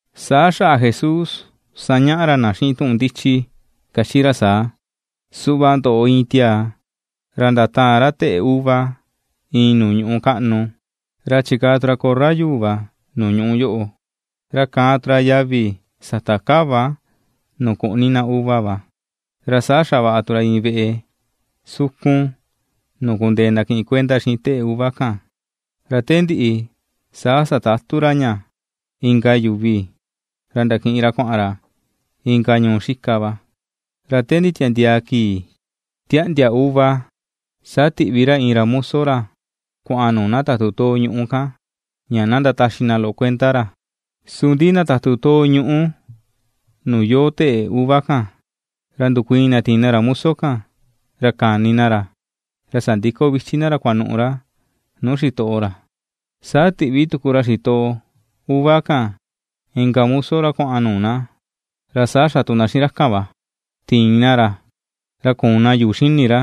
Saa xaꞌa Jesús sañaꞌa ra na xiꞌin tuꞌun ndichi, kachi ra saa: ―Suꞌva ndoꞌo iin tiaa, ra ndataan teꞌe uva iin nuu ñuꞌu kaꞌnu, ra chikaa tu ra korra yuu va nuu ñuꞌu yoꞌo, ra kaan tu ra yavi sata kava nuu kuꞌni na uva va, ra saa xavaꞌa tu ra iin veꞌe sukun nuu kundee na kiꞌin kuenda xiꞌin teꞌe uva kan; ra te ndiꞌi saa satatu ra ña inka yuvi, ra ndakiꞌin ra kuaꞌan ra inka ñuu xika va. Ra te nditiandiaa kii tiaꞌndia uva, saa tiꞌvi ra iin muso ra kuaꞌan nuu na tatu too ñuꞌu kan, ña na ndataxi na loꞌo kuenda ra. Su ndi na tatu ñuꞌu nuu yoo teꞌe uva kan, ra ndukuiin na tiin na ra muso kan, ra kani na ra, ra sandiko vichi na ra kuanu̱ꞌu̱ ra nuu xitoꞌo ra. Saa tiꞌvi tuku ra xitoꞌo uva kan inka muso kuaꞌan nuu na, ra saa xa tu na xiꞌin ra kan va: tiin na ra, ra kuun na yuu xini ra,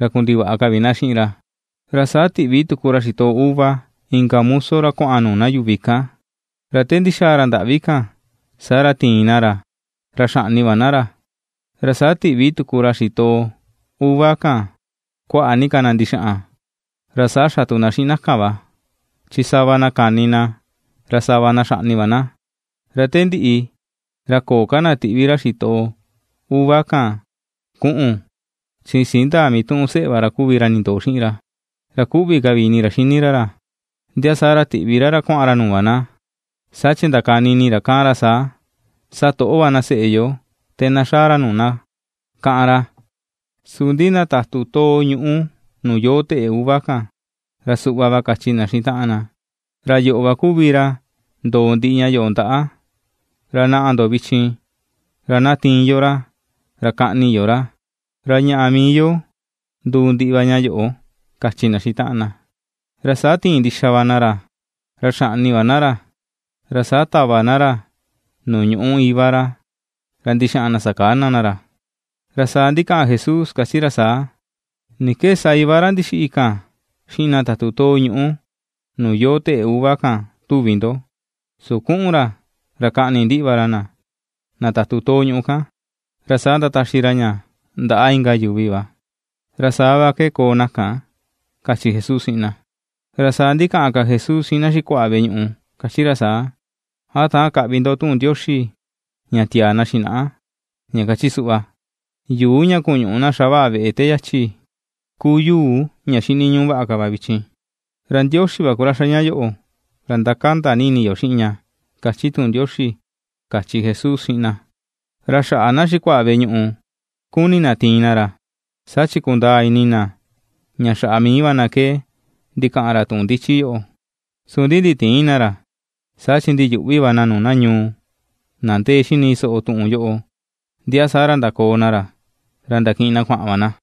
ra kundivaꞌa ka vi na xiꞌin ra. Ra saa tiꞌvi tuku ra xitoꞌo uva inka muso ra kuaꞌan nuu na yuvi kan, ra te ndixaa ra ndaꞌvi kan, saa ra tiin na ra, ra xaꞌni va na ra. Ra saa tiꞌvi ka ra xitoꞌo uva kan kuaꞌa ni ka na ndixaꞌan, ra saa xa tu na xiꞌin na kan va, chi sava na kani na, ra sava na xaꞌni va na. ’Ra te ndiꞌi, ra köo ka na tiꞌvi ra xitoꞌo uva kan kuꞌu̱n, chi siin ndaa mituꞌun seꞌe va ra kuvi ra ndindoo xiꞌin ra, ra kuꞌvi ka vi ini ra xini ra ra. Ndia saa ra tiꞌvi ra ra kuaꞌan ra nuu va na, saa chi ndakani ini ra kaꞌan ra saa, “Satoꞌo va na seꞌe yo te na xaa ra nuu na”, kaꞌan ra. Su ndi na tatu too ñuꞌu nuu yoo teꞌe uva kan, ra suꞌva va kachi na xiꞌin taꞌan na: “Ra yoꞌo va kuvi ra ndòò ndiꞌi ña yoꞌo ndaꞌa. Ra naꞌa ndo vichin, ra na tiin yo ra, ra kaꞌni yo ra, ra ñaꞌa mii yo nduu ndiꞌi va ña yoꞌo”, kachi na xiꞌin taꞌan na. Ra saa tiin ndixa va na ra, ra xaꞌni va na ra, ra saa tava na ra nuu ñuꞌu Iva ra, ra ndixaꞌan na sakana na ra. Ra saa ndikaꞌan Jesús, kachi ra saa: ―¿Ni ke sa Iva ra ndixiꞌi kan xiꞌin na tatu too ñuꞌu nuu yoo teꞌe uva kan tuvi ndoꞌo? Su kuꞌun ra ra kaꞌni ndiꞌi va ra, na tatu too ñuꞌu kan, ra saa ndataxi ra ña ndaꞌa inka yuvi va. Ra saa va ke koo na kan ―kachi Jesús xiꞌin na. Ra saa ndikaꞌan ka Jesús xiꞌin na xikuaꞌa veꞌe ñuꞌu, kachi ra saa: ―¿A täan kaꞌvi ndo tuꞌun Ndioxi ña tiaa na xinaꞌa? Ña kachi suꞌva: Yuu ña ku̱ñu̱ꞌu̱ na xavaꞌa veꞌe te yachi ku yuu ña xiniñuꞌu vaꞌa ka va vichin. Ra Ndioxi va ku ra xa ña yoꞌo, ra ndakanda ni ini yo xiꞌin ña, kachi tuꞌun Ndioxi ―kachi Jesús xiꞌin na. Ra xaꞌa na xikuaꞌa veꞌe ñuꞌu kuni na tiin na ra, saa chi kundaa ini na ña xaꞌa mii va na ke ndikaꞌan ra tuꞌun ndichi yoꞌo, su ndi nditïin na ra, saa chi ndiyuꞌvi va na nuu na ñuu, na ndee xini soꞌo tuꞌun yoꞌo, ndia saa ra ndakoo na ra, ra ndakiꞌin na kuaꞌan va na.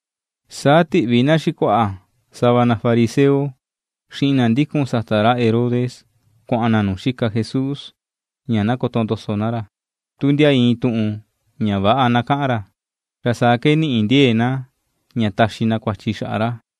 Saa tiꞌvi na xikuaꞌa sava na fariseo xiꞌin na ndikun sata ra Herodes kuaꞌan na nuu xika Jesús ña na kotondoso na ra, tu ndia iin tuꞌun ña väꞌa na kaꞌan ra, ra saa ke ni̱ꞌi̱ ndie̱e̱ na, ña taxi na kuachi xaꞌa ra.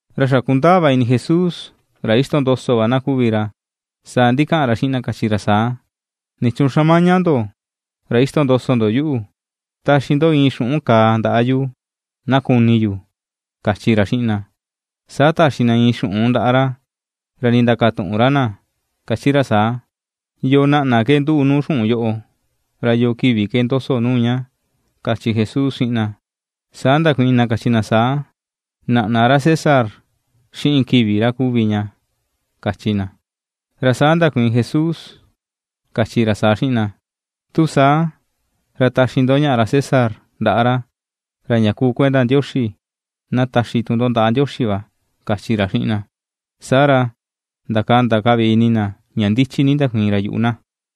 Ra xa kundaa va ini Jesús ra ixtondoso va na kuvi ra, saa ndikaꞌan ra xiꞌin na kachi ra saa: ―¿Nichuun xamaña ndo ra ixtondoso ndo yuꞌu? Taxi ndo iin xuꞌun kaa ndaꞌa yu na kuni yu ―kachi ra xiꞌin na. Saa taxi na iin xuꞌun ndaꞌa ra, ra ndindakatuꞌun ra na kachi ra saa: ―¿Yoo naꞌna ke nduꞌu nuu xuꞌun yoꞌo, ra yo kivi ke ndoso nuu ña? ―kachi Jesús xiꞌin na, Saa ndakuiin na kachi na saa: ―Naꞌna ra César, xiꞌin kivi ra kuvi ña ―kachi na. Ra saa ndakuiin Jesús kachi ra saa xiꞌin na: ―Tu saa, ra taxi ndo ñaꞌa ra César ndaꞌa ra, ra ña ku kuenda Ndioxi, na taxi tu ndo ndaꞌa Ndioxi va ―kachi ra xiꞌin na. Saa ra, ndakanda ka vi ini na ña ndichi ni ndakuiin ra yuꞌu na.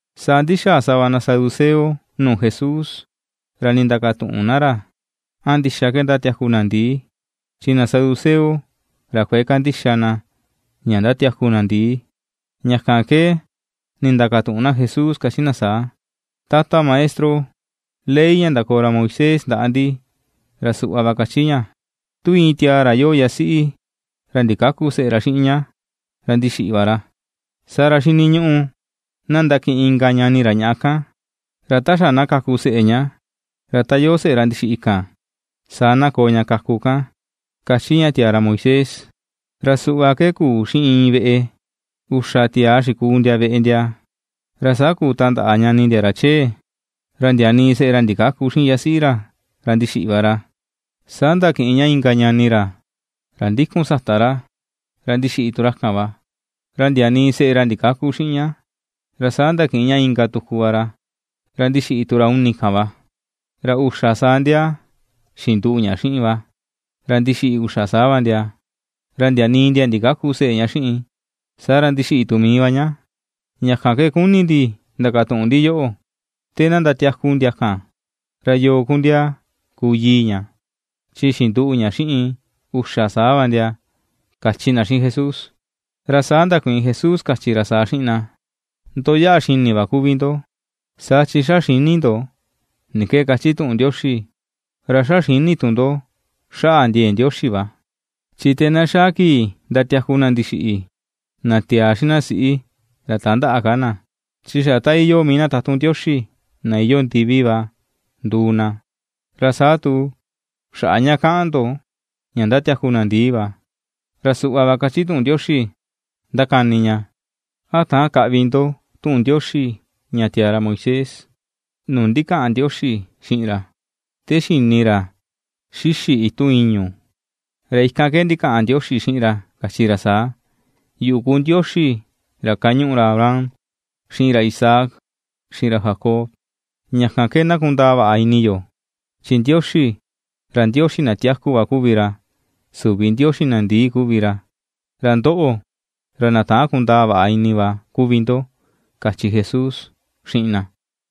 Saa ndaxàà sava na saduceo nuu Jesús, ra ndindakatuꞌun na ra a ndixa ke ndatiaku na ndìì chi na saduceo, ra kuëe kandixa na ña ndatiaku na ndìì. Ña kan ke ndindakatuꞌun na Jesús kachi na saa: ―Tata Maestro, ley ña ndakoo ra Moisés ndaꞌa ndi, ra suꞌva va kachi ña: “Tu iin tiaa ra iyoo yasiꞌi, ra ndikäku seꞌe ra xiꞌin ña, ra ndixiꞌi va ra, saa ra xiniñuꞌu na ndakiꞌin inka ñani ra ñaꞌa kan, ra ta xa na kaku seꞌe ña, ra ta yoo seꞌe ra ndixiꞌi kan, saa na koo ña kaku kan”, kachi ña tiaa ra Moisés. Ra suꞌva ke kuu xiꞌin iin veꞌe: uxa tiaa xikuu ndia veꞌe ndia. Ra saa kuu tandaꞌa ñani ndia ra chee, ra ndia nii seꞌe ra ndikäku xiꞌin yasiꞌi ra, ra ndixiꞌi va ra. Saa ndakiꞌin ña inka ñani ra, ra ndikun sata ra, ra ndixiꞌi tu ra kan va, ra ndia nii seꞌe ra ndikäku xiꞌin ña. Ra saa ndakiꞌin ña inka tuku va ra, ra ndixiꞌi tu ra uni kan va. Ra uxa saa ndia xinduꞌu ña xiꞌin va, ra ndixiꞌi uxa saa va ndia; ra ndia nii ndia ndikäku seꞌe ña xiꞌin. Saa ra ndixiꞌi tu mii va ña. Ña kan ke kuni ndi ndakatuꞌun ndi yoꞌo: te na ndatiaku ndia kan, ¿ra yoo ku ndia kuu yii ña, chi xinduꞌu ña xiꞌin uxa saa va ndia? ―kachi na xiꞌin Jesús. Ra saa ndakuiin Jesús kachi ra saa xiꞌin na: ―Ndo yaꞌa xini va kuvi ndo, saa chi xa xïni ndo ni ke kachi tuꞌun Ndioxi, ra xa xïni tu ndo xaꞌa ndie̱e̱ Ndioxi va. Chi te na xaa kii ndatiaku na ndixiꞌi, na tiaa xiꞌin na siꞌi ra tandäꞌa ka na, chi xa ta iyoo mii na tatun Ndioxi, na iyoo ndivi va, nduu na. Ra saa tu, xaꞌa ña kaꞌan ndo ña ndatiaku na ndìì va, ra suꞌva va kachi tuꞌun Ndioxi ndakani ña, ¿A täan kaꞌvi ndo tuꞌun Ndioxi ña tiaa ra Moisés, nuu ndikaꞌan Ndioxi xiꞌin ra, te xini ra xixi̱ itun ìñu̱? Ra ikan ke ndikaꞌan Ndioxi xiꞌin ra kachi ra saa: “Yuꞌu ku Ndioxi ra kañuꞌu ra Abraham, xiꞌin ra Isaac, xiꞌin ra Jacob.” Ña kan ke na kundaa vaꞌa ini yo, chin Ndioxi, ra Ndioxi na tiaku va kuvi ra, süvi Ndioxi na ndii kuvi ra. Ra ndoꞌo, ra na täan kundaa vaꞌa ini va kuvi ndo ―kachi Jesús xiꞌin na.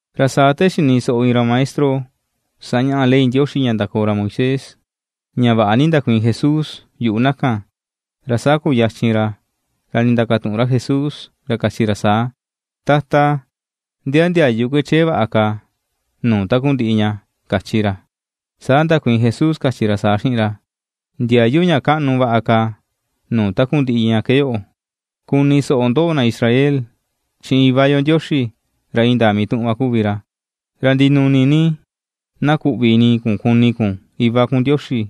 Ra saa te xini soꞌo iin ra maestro sañaꞌa ley Ndioxi ña ndakoo ra Moisés, ña vaꞌa ni ndakuiin Jesús yuꞌu na kan, ra saa kuyachin ra ndindakatuꞌun ra Jesús, kachi ra saa: ―¿Tata ndia ndiayu ke chee vaꞌa ka nuu takundiꞌi ña? ―kachi ra. Saa ndakuiin Jesús, kachi ra saa xiꞌin ra: ―Ndiayu ña kaꞌnu vaꞌa ka nuu takundiꞌi ña ke yoꞌo: “Kuni soꞌo ndoꞌo na Israel, chi Iva yo Ndioxi ra indaa mituꞌun va kuvi ra. Ra ndinuni ni na kuꞌvi ini kun kuni kun Iva kun Ndioxi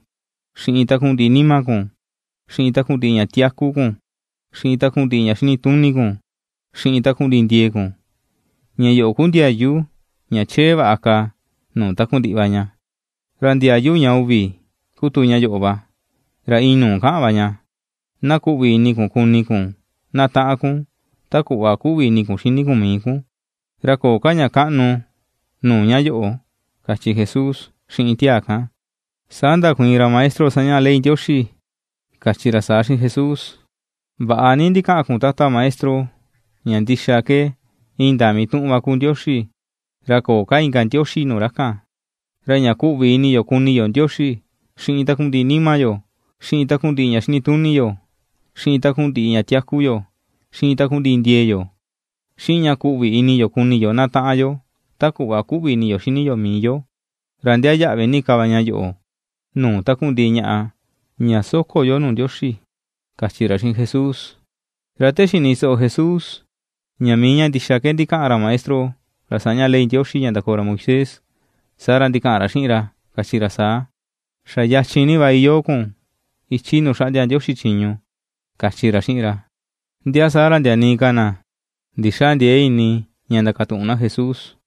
xiꞌin takundiꞌi nima kun, xiꞌin takundiꞌi ña tiaku kun, xiꞌin takundiꞌi ña xinituni kun, xiꞌin takundiꞌi ndie̱e̱ kun;” ña yoꞌo ku ndiayu ña chee vaꞌa ka nuu takundiꞌi va ña. Ra ndiayu ña uvi ku tu ña yoꞌo, ra iin nuu kaꞌan va ña: “Na kuꞌvi ini kun kuni kun na taꞌan kun ta kuꞌva kuꞌvi ini kun xini kun mii kun.” Ra köo ka ña kaꞌnu nuu ña yoꞌo ―kachi Jesús xiꞌin tiaa kan. Saa ndakuiin ra maestro sañaꞌa ley Ndioxi, kachi ra saa xiꞌin Jesús: ―Vaꞌa ni ndikaꞌan kun, Tata Maestro, ña ndixa ke, indaa mituꞌun va ku Ndioxi, ra köo ka inka Ndioxi nuu ra kan. Ra ña kuꞌvi ini yo kuni yo Ndioxi xiꞌin takundiꞌi nima yo, xiꞌin takundiꞌi ña xinituni yo, xiꞌin takundiꞌi ña tiaku yo, xiꞌin takundiꞌi ndie̱e̱ yo, xiꞌin ña kuꞌvi ini yo kuni yo na taꞌan yo ta kuꞌva kuꞌvi ini yo xini yo mii yo, ra ndiaa yaꞌvi ni ka va ña yoꞌo nuu takundiꞌi ñaꞌa ña soko yo nuu Ndioxi ―kachi ra xiꞌin Jesús. Ra te xini soꞌo Jesús ña mii ña ndixa ke ndikaꞌan ra maestro sañaꞌa ley Ndioxi ña ndakoo ra Moisés, saa ra ndikaꞌan ra xiꞌin ra, kachi ra saa: ―Xa yachin ni va iyoo kun ichi nuu xaꞌndia Ndioxi chiñu ―kachi ra xiꞌin ra. Ndia saa ra ndia nii ka na ndixändiee ini ña ndakatuꞌun na Jesús.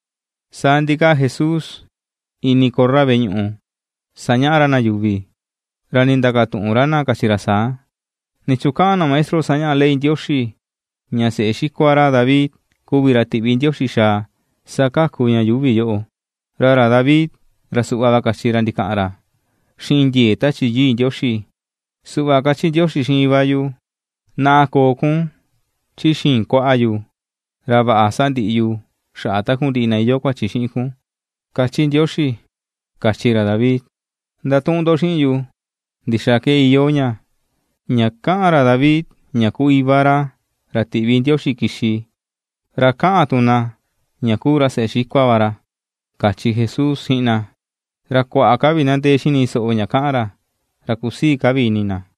Saa ndikaa Jesús ini korra veꞌe ñuꞌu sañaꞌa ra na yuvi, ra ndindakatuꞌun ra na kachi ra saa: ―¿Nichuun kaꞌan na maestro sañaꞌa ley Ndioxi ña seꞌe xikua ra David kuvi ra tiꞌvi Ndioxi xaa sakaku ña yuuvi yoꞌo? Ra ra David, ra suꞌva va kachi ra, ndikaꞌan ra xiꞌin ndie̱e̱ Tachi Yii Ndioxi: “Suꞌva kachi Ndioxi xiꞌin Iva yu, ‘Naꞌa, koo kun chi xii̱n kuaꞌa yu, ra vaꞌa sandiꞌi yu xaꞌa takundiꞌi na iyoo kuachi xiꞌin kun’”, kachi Ndioxi, kachi ra David. Ndatuꞌun ndo xiꞌin yu, ¿Ndixaa ke iyoo ña, ña kaꞌan ra David ña ku Iva ra, ra tiꞌvi Ndioxi kixi, ra kaꞌan tu na ña kuu ra seꞌe xikua va ra? ―kachi Jesús xiꞌin na. Ra kuaꞌa ka vi na ndee xini soꞌo ña kaꞌan ra, ra kusii ka vi ini na.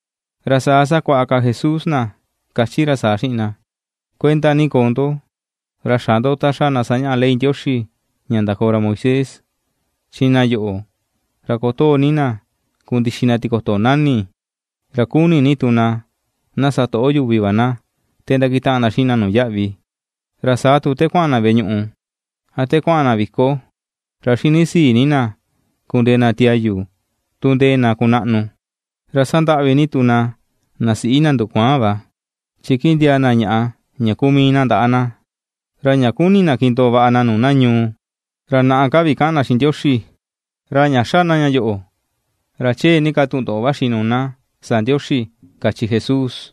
Ra saa sakuaꞌa ka Jesús na, kachi ra saa: ―Kuenda ni koo ndo, ra xä ndo ta xa na sañaꞌa ley Ndioxi ña ndakoo ra Moisés, chi na yoꞌo ra kotoo ni na kundixi na tikoto nani̱, ra kuni ni tu na na satoꞌo ni yuvi na te ndakutaꞌan na xiꞌin na nuu yaꞌvi. Ra saa tu te kuaꞌan na veꞌe ñuꞌu a te kuaꞌan na viko, ra xini sii ni na kundee na tiayu tu ndee na kunaꞌnu. Ra sandaꞌvi ni tu na, na siꞌi na ndukuaan va, chi kindiaa na ñaꞌa ña ku mii na ndaꞌa na. Ra ña kuni na kindoo vaꞌa na nuu na ñuu, ra naꞌa ka vi kaꞌan na xiꞌin Ndioxi. Ra ña xa na ña yoꞌo, ra chee ni ka tundoꞌo vaxi nuu na sa Ndioxi ―kachi Jesús.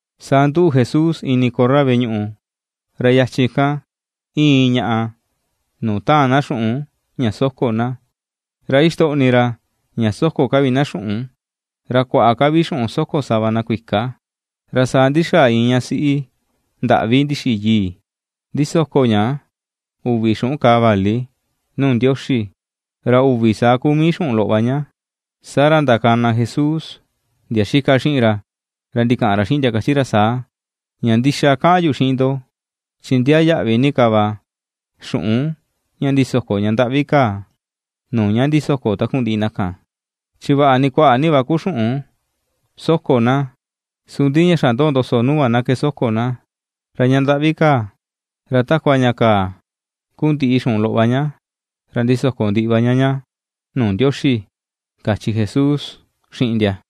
Saa nduꞌu Jesús ini korra veꞌe ñuꞌu, ra yachin kan iin iin ñaꞌa nuu taan na xuꞌun ña soko na. Ra ixtoꞌni ra ña soko ka vi na xuꞌun, ra kuaꞌa ka vi xuꞌun soko sava na kuika. Ra saa ndi̱xa̱a̱ iin ña siꞌi ndaꞌvi ndixiꞌi yii, ndisoko ña uvi xuꞌun kàà vali nuu Ndioxi, ra uvi saa ku mii xuꞌun loꞌo va ña. Saa ra ndakana Jesús ndia xika xiꞌin ra, ra ndikaꞌan ra xiꞌin ndia, kachi ra saa: ―Ña ndixa kaꞌan yu xiꞌin ndo, chi ndiaa yaꞌvi ni ka va xuꞌun ña ndisoko ña ndaꞌvi kaa nuu ña ndisoko takundiꞌi na kan. Chi vaꞌa ni kuaꞌa ni va ku xuꞌun soko na, su ndi ña xa ndoo ndoso nuu va na ke soko na. Ra ña ndaꞌvi kaa, ra takua ña kaa ku ndiꞌi xuꞌun loꞌo va ña, ra ndisoko ndiꞌi va ña ña nuu Ndioxi ―kachi Jesús xiꞌin ndia.